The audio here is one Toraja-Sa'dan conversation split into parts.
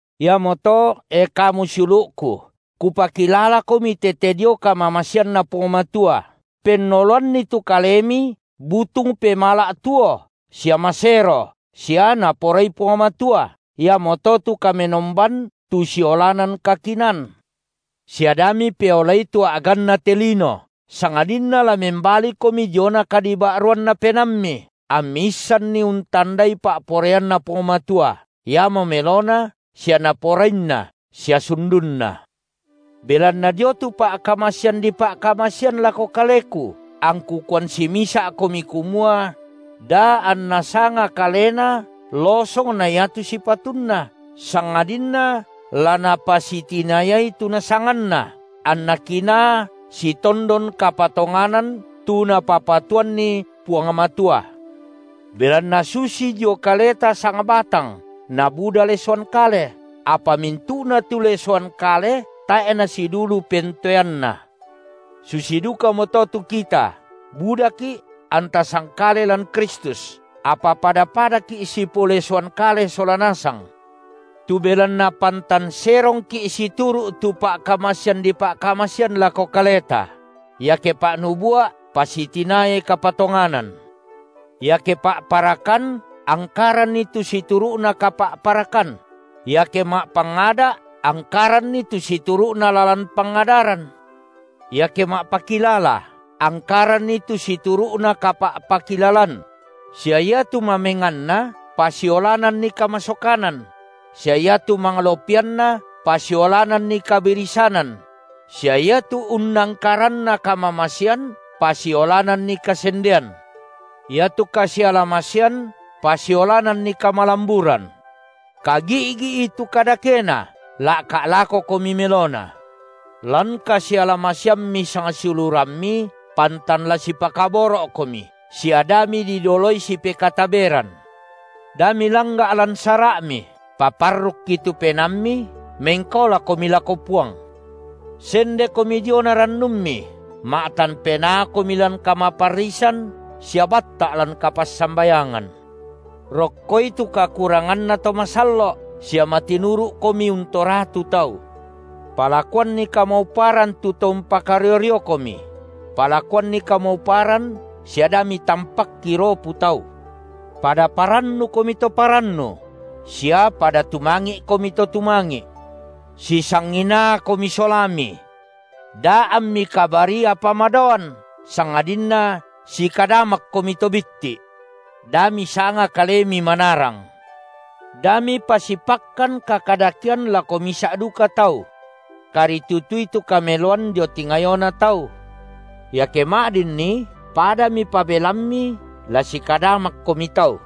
Iamoto, e kamu siulu’ku, kupakilalakomi tete dio kamamaseanNa Puang Matua, pennoloanni tu kalemi butung pemala’ tuo sia masero sia Naporai Puang Matua, iamoto tu kamenomban tu siolanan kakinaan. Sia da mipeolai tu a’ganna te lino, sangadinna la membalikomi diona kadiba’ruanna penaammi, ammi issanni untandai pa’poraianNa Puang Matua, iamo melona sia Naporainna sia sundunna. Belanna dio tu pa’kamasean dipa’kamasean lako kaleku, angku kuan simisa’komi kumua: da anna sanga kalena losong na iatu sipatunna, sangadinna la napasitinayai tu nasanganna anna kinaa sitondon kapatonganan tu Napapatuanni Puang Matua. Belanna susi dio kaleta sangbatang nabuda lesoan kale, apa mintu’na tu lesoan kale tae’ nasidulu pentoeanna, susi dukamoto tu kita budaki’ anta sangkale lan Kristus, apa pada-padaki’ sipolesoan kale sola nasang. Tu belanna pantan serongki’ situru’ tu pa’kamasean dipa’kamasean lako kaleta: iake pa’nubua’, pasitinayai kapatonganan; iake pa’parakan, angkaranni tu situru’na kapa’parakan; iake ma’pangada’, angkaranni tu situru’na lalan pangadaran; iake ma’pakilala, angkaranni tu situru’na kapa’pakilalan; sia iatu mamenganna pasiolananni kamasokanan; sia iatu manglopianna pasiolananni kabirisanan; sia iatu unnangkaranna kamamasean pasiolananni kasendean. Iatu kasialamasean pasiolananni kamalamburan. Kagi’gi’i tu kadakena la’ka’ lakokomi melona. Lan kasialamaseammi sangsiulurammi, pantan la sipakaboro’komi sia da mididoloi sipekataberan. Da milangga’ lan sara’mi; paparrukki tu penaammi, mengkaolakomi lako Puang. Sendekomi diona rannummi, ma’tan penaakomi lan kamaparrisan, sia batta’ lan kapassambayangan. Rokkoi tu kakuranganna to masallo’ sia matinuru’komi untoratu tau. Palakuanni kamauparan tu to umpakario-riokomi; palakuanni kamauparan sia da mitampakki ropu tau. Pada parannukomi to parannu; sia pada tumangi’komi to tumangi’. Sisanginaakomi solami. Da ammi kabarii apa madaoan, sangadinna sikadamakkomi to bitti’. Da misanga kalemi manarang. Da mipasipakkan kakadakean lako misa’ duka tau. Karitutui tu kameloan dio tingayona tau. Iake ma’dinni padami pabelammi la sikadamakkomi tau.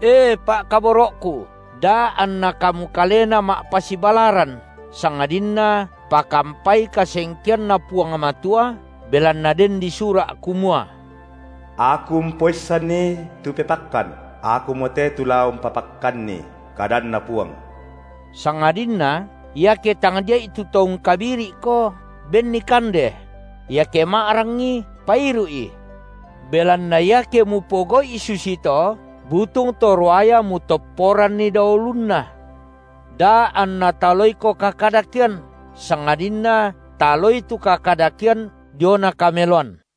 E pa’kaboro’ku, da anna kamu kalena ma’pasibalaran, sangadinna pakampai kasengkeanNa Puang Matua, belanna den disura’ kumua: Aku umpoissanni tu pepakkan; Akumote tu la umpapakkanni, kadanNa Puang. Sangadinna, iake tangdia’i tu to ungkabiri’ko, benni kande; iake ma’rangi, pairu’i. Belanna, iake mupogau’i susito, butung to ruaya mutopporanni dao ulunna. Da anna taloiko kakadakean, sangadinna taloi tu kakadakean diona kameloan.